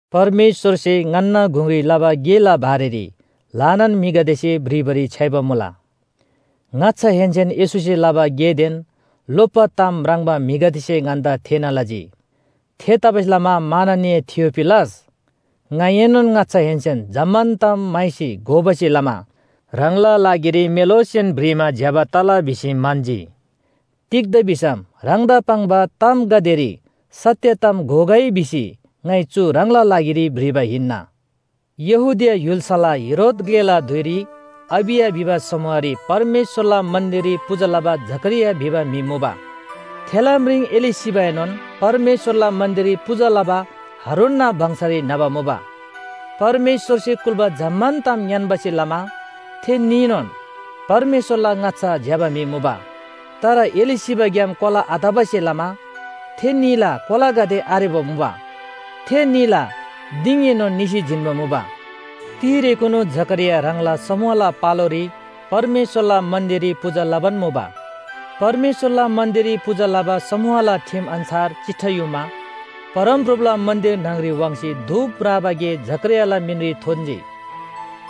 परमेश्‍वरसे ङन्‍ना गुङरी लबा गेला बारेरी ल्‍हानान म्‍हिगदेसे भ्रिबारी छ्‌याइबा मुला। ङाच्‍छाहेन्‍सेन येशूसे लबा गेदेन लोप्‍बा ताम म्राङ्बा म्‍हिगदेसे ङन्‍दा थेःना लजी। थेतबासेलमा माननीय थियोफिलस, ङाइएनोन ङाच्‍छाहेन्‍सेन जम्‍मान ताम म्‍हाइसी घोबासे लमा ह्राङला लागिरी मेलोसेन भ्रिमा ज्‍यबा तला भिसी म्‍हन्‍जी। तिग्‍दा भिसम ह्राङदा पाङ्बा तामगदेरी सत्‍य ताम घोगै भिसी ङाइ चु ह्राङला लागिरी भ्रिबा हिन्‍ना। यहूदिया य्‍हुल्‍साला हेरोद ग्‍लेला धुइरी अबिया भिबा समूहरी परमेश्‍वरला मन्‍दिररी पूजा लबा जकरिया भिबा म्‍हि मुबा। थेला म्रिङ एलीशिबाएनोन परमेश्‍वरला मन्‍दिररी पूजा लबा हारूनना वंशरी न्‍हबा मुबा। परमेश्‍वरसे कुल्‍बा जम्‍मान ताम ङ्‌यान्‍बासे लमा थे न्‍हीनोन परमेश्‍वरला ङाच्‍छा ज्‍यबा म्‍हि मुबा। तर एलीशिबाग्‍याम कोला आतबासे लमा थे न्‍हीला कोलागदे आरेबा मुबा। थे न्‍हीला दिङएनोन निसी जिन्‍बा मुबा। तिरेकुनु जकरिया ह्राङला समूहला पालोरी परमेश्‍वरला मन्‍दिररी पूजा लबान मुबा। परमेश्‍वरला मन्‍दिररी पूजा लबा समूहला ठिम अन्‍छार चिट्ठा युमा, परमप्रभुला मन्‍दिर न्‍हङरी वाङ्सी धूप म्राबा गे जकरियाला मिनरी थोन्‍जी।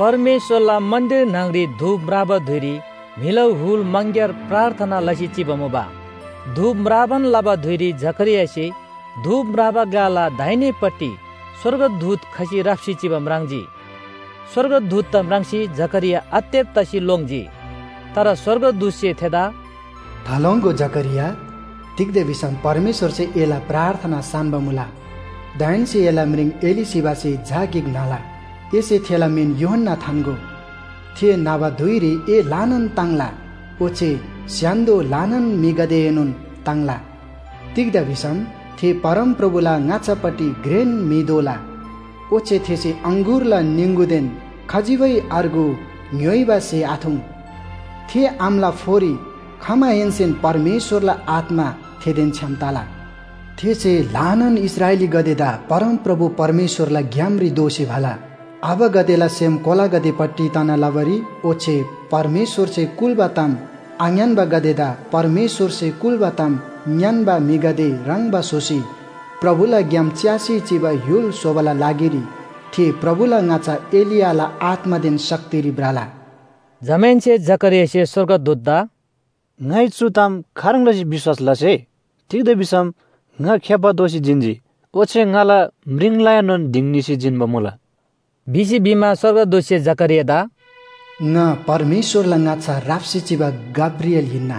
परमेश्‍वरला मन्‍दिर न्‍हङरी धूप म्राबा धुइरी म्‍हिला हुल मङग्‍यार प्रार्थना लसी चिबा मुबा। धूप म्राबान लबा धुइरी जकरियासे धूप म्राबा ग्‍लाला दाहिनेपट्टि स्‍वर्गदूत खसी राप्‍सी चिबा म्राङ्जी। स्‍वर्गदूतदा म्राङ्सी जकरिया आत्तेब तसी लोङ्जी। तर स्‍वर्गदूतसे थेदा “थालोङ्‍गो जकरिया, तिग्‍दा भिसम परमेश्‍वरसे एला प्रार्थना सान्‍बा मुला। दाहेन्‍से एला म्रिङ एलीशिबासे झा गिक न्‍हला। एसे थेला मिन यूहन्‍ना थान्‍गो। थे न्‍हबा धुइरी ए ल्‍हानान ताङ्ला, ओच्‍छे स्‍य्‍हान्‍दो ल्‍हानान म्‍हिगदेएनोन ताङ्ला। तिग्‍दा भिसम थे परमप्रभुला ङाच्‍छापट्टि घ्रेन म्‍हि दोला। ओच्‍छे थेसे अङगुरला निङगुदेन खजिबै अर्गु ङ्‌य्‍होइबा स्‍हे आथुङ्। थे आमाला फोरी खमाहेन्‍सेन परमेश्‍वरला आत्‍मा थेदेन छ्‌याम तला। थेसे ल्‍हानान इस्राएलीगदेदा परमप्रभु परमेश्‍वरला ग्‍यामरी दोःसी भला। आबागदेला सेम कोलागदेपट्टि तना लबारी ओच्‍छे परमेश्‍वरसे कुल्‍बा ताम आङ्‌यान्‍बागदेदा परमेश्‍वरसे कुल्‍बा ताम ङ्‌यान्‍बा म्‍हिगदे ह्रङ्‌बा स्‍होसी प्रभुला ग्‍याम च्‍यासी चिबा य्‍हुल स्‍होबाला लागिरी थे प्रभुला ङाच्‍छा एलियाला आत्‍मादेन शक्तिरी भ्रला। जमाहेन्‍से जकरियासे स्‍वर्गदूतदा “ङाइ चु ताम खाह्रङ् लसी विश्‍वास लसे? तिग्‍दा भिसम ङा खेप्‍बा दोसी जिन्‍जी ओच्‍छे ङाला म्रिङलाएनोन दिङ निसी जिन्‍बा मुला” भिसी भिमा, स्‍वर्गदूतसे जकरियादा “ङा परमेश्‍वरला ङाच्‍छा राप्‍सी चिबा गब्रिएल हिन्‍ना।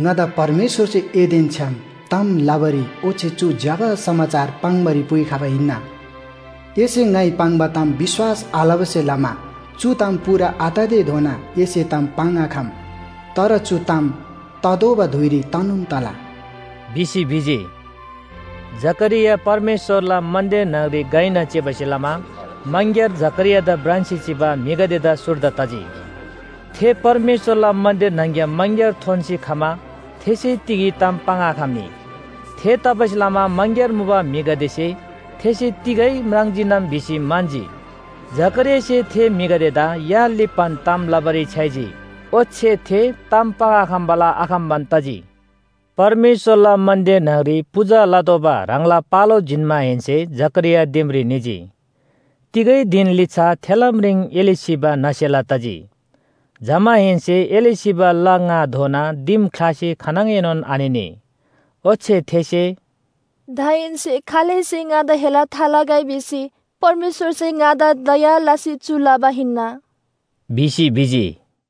ङादा परमेश्‍वरसे एदेन छ्‌याम ताम लबारी ओच्‍छे चु ज्‍यबा समाचार पाङ्‌बारी पुइखबा हिन्‍ना। एसे ङाइ पाङ्बा ताम विश्‍वास आलबासे लमा चु ताम पूरा आततेधोना एसे ताम पाङ्‌आखम। तर चु ताम ततोःबा धुइरी तनोन तला” भिसी भिजी। जकरिया परमेश्‍वरला मन्‍दिर न्‍हङरी घइना चिबासे लमा मङग्‍यार जकरियादा भ्रान्‍सी चिबा म्‍हिगदेदा सुर्दा तजी। थे परमेश्‍वरला मन्‍दिर न्‍हङ‍ग्‍याम मङग्‍यार थोन्‍सी खमा थेसे तिगै ताम पाङ्आखम्‍नी। थेतबासेलमा मङग्‍यार मुबा म्‍हिगदेसे थेसे तिगै म्राङ्जीनम भिसी म्‍हन्‍जी। जकरियासे थे म्‍हिगदेदा या लिप्‍बान ताम लबारी छ्‌याइजी। ओच्‍छे थे ताम पाङ्आखम्‍बाला आखम्‍बान तजी। परमेश्‍वरला मन्‍दिर न्‍हङरी पूजा लतोःबा ह्राङला पालो जिन्‍माहेन्‍से जकरिया दिमरी निजी। तिगै धिन लिच्‍छा थेला म्रिङ एलीशिबा न्‍हसेला तजी। जमाहेन्‍से एलीशिबा ला ङाधोना दिम ख्‍लासी खानङएनोन आनिनी। ओच्‍छे थेसे “दाहेन्‍से खालैसे ङादा हेला थालगै भिसी परमेश्‍वरसे ङादा दया लसी चु लबा हिन्‍ना” भिसी भिजी।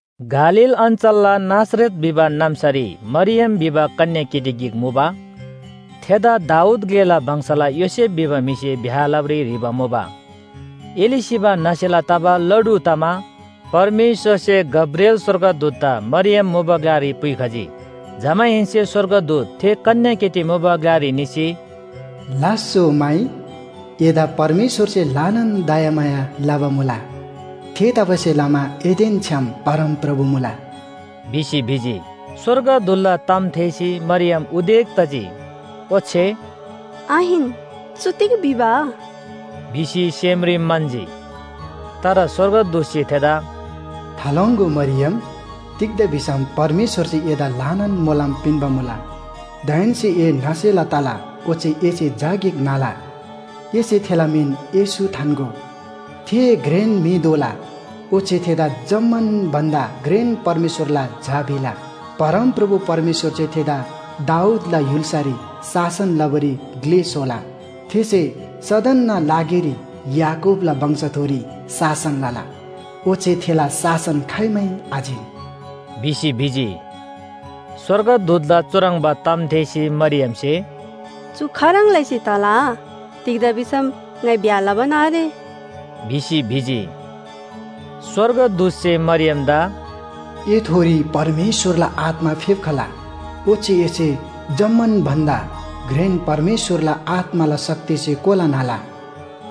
गालील अञ्‍चलला नासरत भिबा नाम्‍सारी मरियम भिबा कन्‍याकेटी गिक मुबा। थेदा दाऊद ग्‍लेला वंशला योसेफ भिबा म्‍हिसे ब्‍याह लबारी ह्रीबा मुबा। एलीशिबा न्‍हसेला तबा ला ढु तमा परमेश्‍वरसे गब्रिएल स्‍वर्गदूतदा मरियम मुबा ग्‍लारी पुइखजी। जमाहेन्‍से स्‍वर्गदूत थे कन्‍याकेटी मुबा ग्‍लारी निसी, “लास्‍सो माइ, एदा परमेश्‍वरसे ल्‍हानान दयामाया लबा मुला। थेतबासेलमा एदेन छ्‌याम परमप्रभु मुला” भिसी भिजी। स्‍वर्गदूतला ताम थेःसी मरियम उदेक तजी। ओच्‍छे “आहिन, चु तिग भिबा?” भिसी सेमरी म्‍हन्‍जी। तर स्‍वर्गदूतसे थेदा “थालोङ्‍गो मरियम, तिग्‍दा भिसम परमेश्‍वरसे एदा ल्‍हानान मोलम पिन्‍बा मुला। दाहेन्‍से ए न्‍हसेला तला ओच्‍छे एसे झा गिक न्‍हला। एसे थेला मिन येशू थान्‍गो। थे घ्रेन म्‍हि दोला ओच्‍छे थेदा जम्‍मान भन्‍दा घ्रेन परमेश्‍वरला झा भिला। परमप्रभु परमेश्‍वरसे थेदा दाऊदला य्‍हुल्‍सारी शासन लबारी ग्‍ले स्‍होला। थेसे सदनना लागिरी याकूबला वंशथोरी शासन लला। ओच्‍छे थेला शासन खाइमै आजिन” भिसी भिजी। स्‍वर्गदूतला चुह्रङ्बा ताम थेःसी मरियमसे “चु खाह्रङ् लसी तला? तिग्‍दा भिसम ङाइ ब्‍याह लबान आरे” भिसी भिजी। स्‍वर्गदूतसे मरियमदा “एथोरी परमेश्‍वरला आत्‍मा फेप्‍खला। ओच्‍छे एसे जम्‍मान भन्‍दा घ्रेन परमेश्‍वरला आत्‍माला शक्तिसे कोला न्‍हला।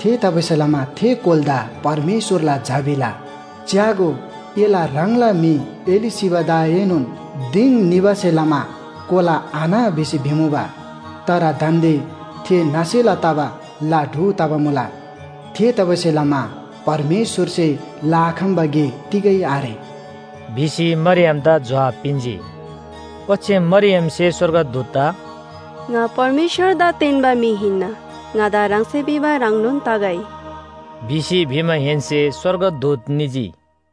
थेतबासेलमा थे कोलादा परमेश्‍वरला झा भिला। च्‍यागो, एला ह्राङला म्‍हि एलीशिबादाएनोन दिङ निबासे लमा कोला आन्‍ह भिसी भिमुबा। तर दान्‍दे थे न्‍हसेला तबा ला ढु तबा मुला। थेतबासेलमा परमेश्‍वरसे लआखम्‍बा गे तिगै आरे” भिसी मरियमदा जोहाब पिन्‍जी। ओच्‍छे मरियमसे स्‍वर्गदूतदा “ङा परमेश्‍वरदा तेन्‍बा म्‍हि हिन्‍ना, ङादा ह्राङसे भिबा ह्रङ्नोन तगै” भिसी भिमाहेन्‍से स्‍वर्गदूत निजी।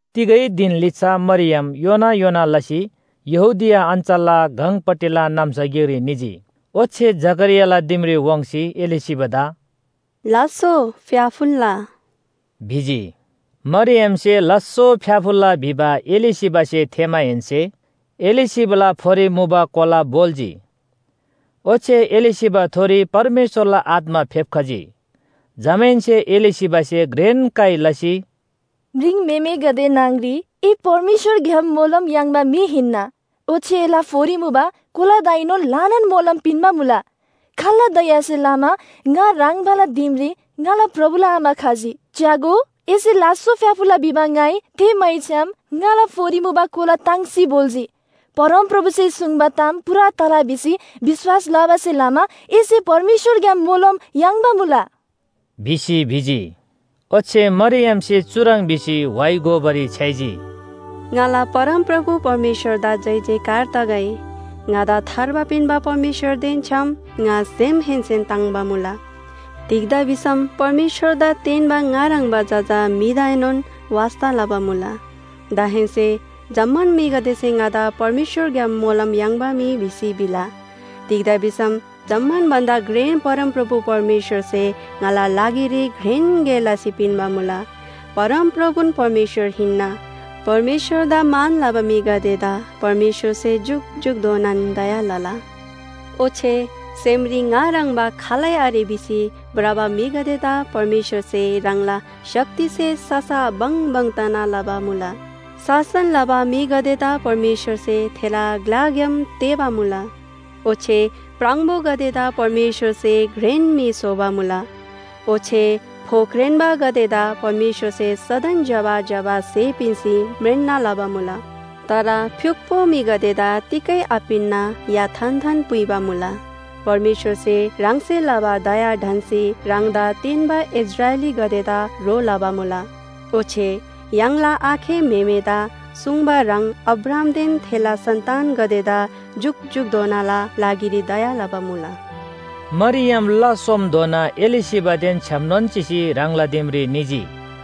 तिगै धिन लिच्‍छा मरियम योना योना लसी यहूदिया अञ्‍चलला गङपट्टिला नाम्‍सा गिकरी निजी। ओच्‍छे जकरियाला दिमरी वाङ्सी एलीशिबादा “लास्‍सो फ्‍याफुल्‍ला” भिजी। मरियमसे लास्‍सो फ्‍याफुल्‍ला भिबा एलीशिबासे थेःमाहेन्‍से एलीशिबाला फोरी मुबा कोला भोल्‍जी। ओच्‍छे एलीशिबाथोरी परमेश्‍वरला आत्‍मा फेप्‍खजी। जमाहेन्‍से एलीशिबासे घ्रेन काइ लसी, “म्रिङम्‍हेमेगदे न्‍हङरी ए परमेश्‍वरग्‍याम मोलम याङ्बा म्‍हि हिन्‍ना। ओच्‍छे एला फोरी मुबा कोलादाएनोन ल्‍हानान मोलम पिन्‍बा मुला। खाल्‍ला दयासे लमा ङा ह्रङ्बाला दिमरी ङाला प्रभुला आमा खजी? च्‍यागो, एसे लास्‍सो फ्‍याफुल्‍ला भिबा ङाइ थेःमैछ्‌याम ङाला फोरी मुबा कोला ताङ्सी भोल्‍जी। परमप्रभुसे सुङ्बा ताम पूरा तला भिसी विश्‍वास लबासे लमा एसे परमेश्‍वरग्‍याम मोलम याङ्बा मुला।” भिसी भिजी। ओच्‍छे मरियमसे चुह्रङ् भिसी व्‍हाइ गोबारी छ्‌याइजी, “ङाला परमप्रभु परमेश्‍वरदा जयजयकार तगै। ङादा थार्बा पिन्‍बा परमेश्‍वरदेन छ्‌याम ङा सेमहेन्‍सेन ताङ्‍बा मुला। तिग्‍दा भिसम परमेश्‍वरदा तेन्‍बा ङा ह्रङ्‌बा जजा म्‍हिदाएनोन वास्‍ता लबा मुला। दाहेन्‍से जम्‍मान म्‍हिगदेसे ङादा परमेश्‍वरग्‍याम मोलम याङ्बा म्‍हि भिसी भिला। तिग्‍दा भिसम जम्‍मान भन्‍दा घ्रेन परमप्रभु परमेश्‍वरसे ङाला लागिरी घ्रेन गे लसी पिन्‍बा मुला। परमप्रभुन परमेश्‍वर हिन्‍ना। परमेश्‍वरदा मान लबा म्‍हिगदेदा परमेश्‍वरसे जुकजुकधोनान दया लला। ओच्‍छे सेमरी ङा ह्रङ्‌बा खालै आरे भिसी भ्रबा म्‍हिगदेदा परमेश्‍वरसे ह्राङला शक्तिसे ससा बङबङ तना लबा मुला। शासन लबा म्‍हिगदेदा परमेश्‍वरसे थेला ग्‍लाग्‍याम तेःबा मुला। ओच्‍छे प्राङबोगदेदा परमेश्‍वरसे घ्रेन म्‍हि स्‍होबा मुला। ओच्‍छे फोख्रेन्‍बागदेदा परमेश्‍वरसे सदन ज्‍यबा ज्‍यबा स्‍हे पिन्‍सी म्रेन्‍ना लबा मुला। तर फ्‍युक्‍पो म्‍हिगदेदा तिगै आपिन्‍ना या थान्‍थान पुइबा मुला। परमेश्‍वरसे ह्राङसे लबा दया ढन्‍सी ह्राङदा तेन्‍बा इस्राएलीगदेदा ह्रो लबा मुला। ओच्‍छे य्‍हाङला आखे म्‍हेमेदा सुङ्बा ह्रङ् अब्राहामदेन थेला सन्‍तानगदेदा जुकजुकधोनाला लागिरी दया लबा मुला।” मरियम ला सोमधोना एलीशिबादेन छ्‌यामनोन चिसी ह्राङला दिमरी निजी।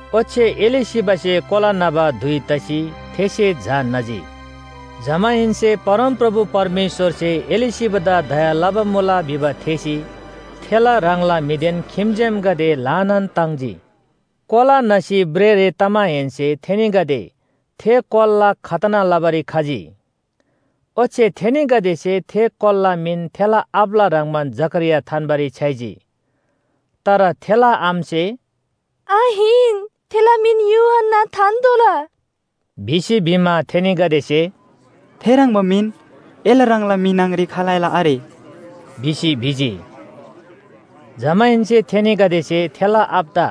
ओच्‍छे एलीशिबासे कोला न्‍हबा धुइ तसी थेसे झा न्‍हजी। जमाहेन्‍से परमप्रभु परमेश्‍वरसे एलीशिबादा दया लबा मुला भिबा थेःसी थेला ह्राङला म्‍हिदेन खिम्‍जेमगदे ल्‍हानान ताङ्जी। कोला न्‍हसी भ्रेःरे तमाहेन्‍से थेनीगदे थे कोलाला खतना लबारी खजी। ओच्‍छे थेनीगदेसे थे कोलाला मिन थेला आबाला ह्रङ्‌बान जकरिया थान्‍बारी छ्‌याइजी, तर थेला आमासे “आहिन, थेला मिन यूहन्‍ना थान्‍तोःला” भिसी भिमा, थेनीगदेसे “थेह्रङ्बा मिन एला ह्राङला म्‍हि न्‍हङरी खालैला आरे” भिसी भिजी। जमाहेन्‍से थेनीगदेसे थेला आबादा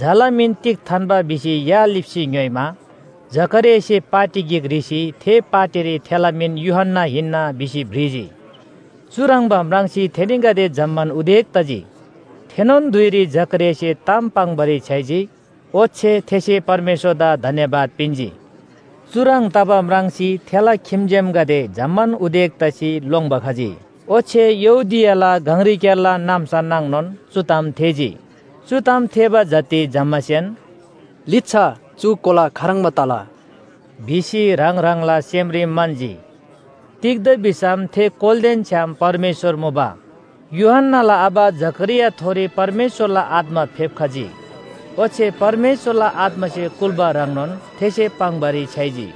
झाला मिन तिग थान्‍बा भिसी या लिप्‍सी ङ्‌योइमा, जकरियासे पाटी गिक ह्रीसी थे पाटीरी थेला मिन यूहन्‍ना हिन्‍ना भिसी भ्रिजी। चुह्रङ्बा म्राङ्सी थेनीगदे जम्‍मान उदेक तजी। थेनोन धुइरी जकरियासे ताम पाङ्‌बारी छ्‌याइजी। ओच्‍छे थेसे परमेश्‍वरदा धन्‍यवाद पिन्‍जी। चुह्रङ् तबा म्राङ्सी थेला खिम्‍जेमगदे जम्‍मान उदेक तसी लोङ्‌बा खजी। ओच्‍छे यहूदियाला गङरीक्‍यारला नाम्‍सा नाङनोन चु ताम थेःजी। चु ताम थेःबा जति जम्‍मासेन “लिच्‍छा चु कोला खाह्रङ्बा तला” भिसी ह्राङ ह्राङला सेमरी म्‍हन्‍जी। तिग्‍दा भिसम थे कोलादेन छ्‌याम परमेश्‍वर मुबा। यूहन्‍नाला आबा जकरियाथोरी परमेश्‍वरला आत्‍मा फेप्‍खजी। ओच्‍छे परमेश्‍वरला आत्‍मासे कुल्‍बा ह्रङ्नोन थेसे पाङ्‌बारी छ्‌याइजी।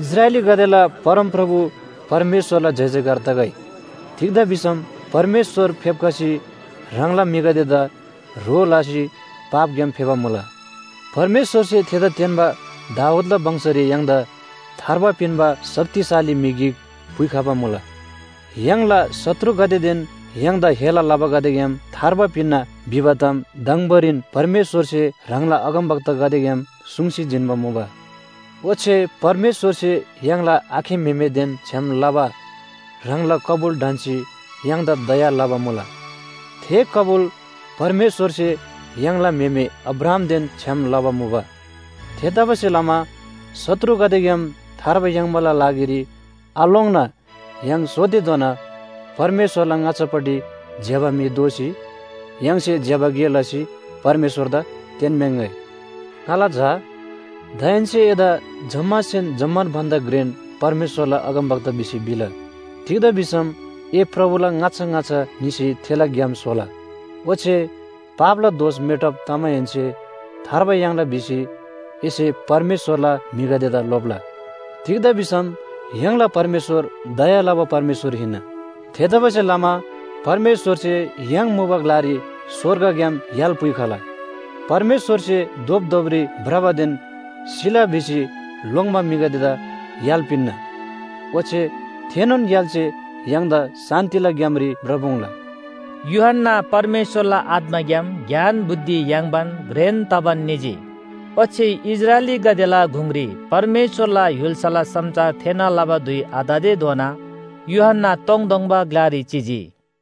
“इस्राएलीगदेला परमप्रभु परमेश्‍वरला जयजयकार तगै तिग्‍दा भिसम परमेश्‍वर फेप्‍खसी ह्राङला म्‍हिगदेदा ह्रो लसी पापग्‍याम फेबा मुला! परमेश्‍वरसे थेदा तेन्‍बा दाऊदला वंशरी य्‍हाङदा थार्बा पिन्‍बा शक्तिशाली म्‍हि गिक पुइखबा मुला। य्‍हाङला शत्रुगदेदेन य्‍हाङदा हेला लबागदेग्‍याम थार्बा पिन्‍ना भिबा ताम दङबोरीन परमेश्‍वरसे ह्राङला अगमवक्तागदेग्‍याम सुङ्सी जिन्‍बा मुबा। ओच्‍छे परमेश्‍वरसे य्‍हाङला आखे म्‍हेमेदेन छ्‌याम लबा ह्राङला कबुल ढन्‍सी य्‍हाङदा दया लबा मुला। थे कबुल परमेश्‍वरसे य्‍हाङला म्‍हेमे अब्राहामदेन छ्‌याम लबा मुबा। थेतबासेलमा शत्रुगदेग्‍याम थार्बा याङ्बाला लागिरी आलोङ्ना य्‍हाङ सोतेधोना परमेश्‍वरला ङाच्‍छापट्टि ज्‍यबा म्‍हि दोसी य्‍हाङसे ज्‍यबा गे लसी परमेश्‍वरदा तेन्‍म्‍याङ्‍गै। ङाला झा, दाहेन्‍से एदा जम्‍मासेन जम्‍मान भन्‍दा घ्रेन परमेश्‍वरला अगमवक्ता भिसी भिला। तिग्‍दा भिसम ए प्रभुला ङाच्‍छा ङाच्‍छा निसी थेला ग्‍याम स्‍होला। ओच्‍छे पापला दोष मेटब तमाहेन्‍से थार्बा याङ्ला भिसी एसे परमेश्‍वरला म्‍हिगदेदा लोप्‍ला। तिग्‍दा भिसम य्‍हाङला परमेश्‍वर दया लबा परमेश्‍वर हिन्‍ना। थेतबासेलमा परमेश्‍वरसे य्‍हाङ मुबा ग्‍लारी स्‍वर्गग्‍याम य्‍हाल पुइखला। परमेश्‍वरसे धोपधोपरी भ्रबादेन सिला भिसी लोङ्‌बा म्‍हिगदेदा य्‍हाल पिन्‍ना। ओच्‍छे थेनोन य्‍हालसे य्‍हाङदा शान्‍तिला ग्‍यामरी भ्रपुङ्ला।” यूहन्‍ना परमेश्‍वरला आत्‍माग्‍याम ज्ञान बुद्धि याङ्बान घ्रेन तबान निजी। ओच्‍छे इस्राएलीगदेला गुङरी परमेश्‍वरला य्‍हुल्‍साला समाचार थेःना लबा धुइ आततेधोना यूहन्‍ना तोङतोङबा ग्‍लारी चिजी।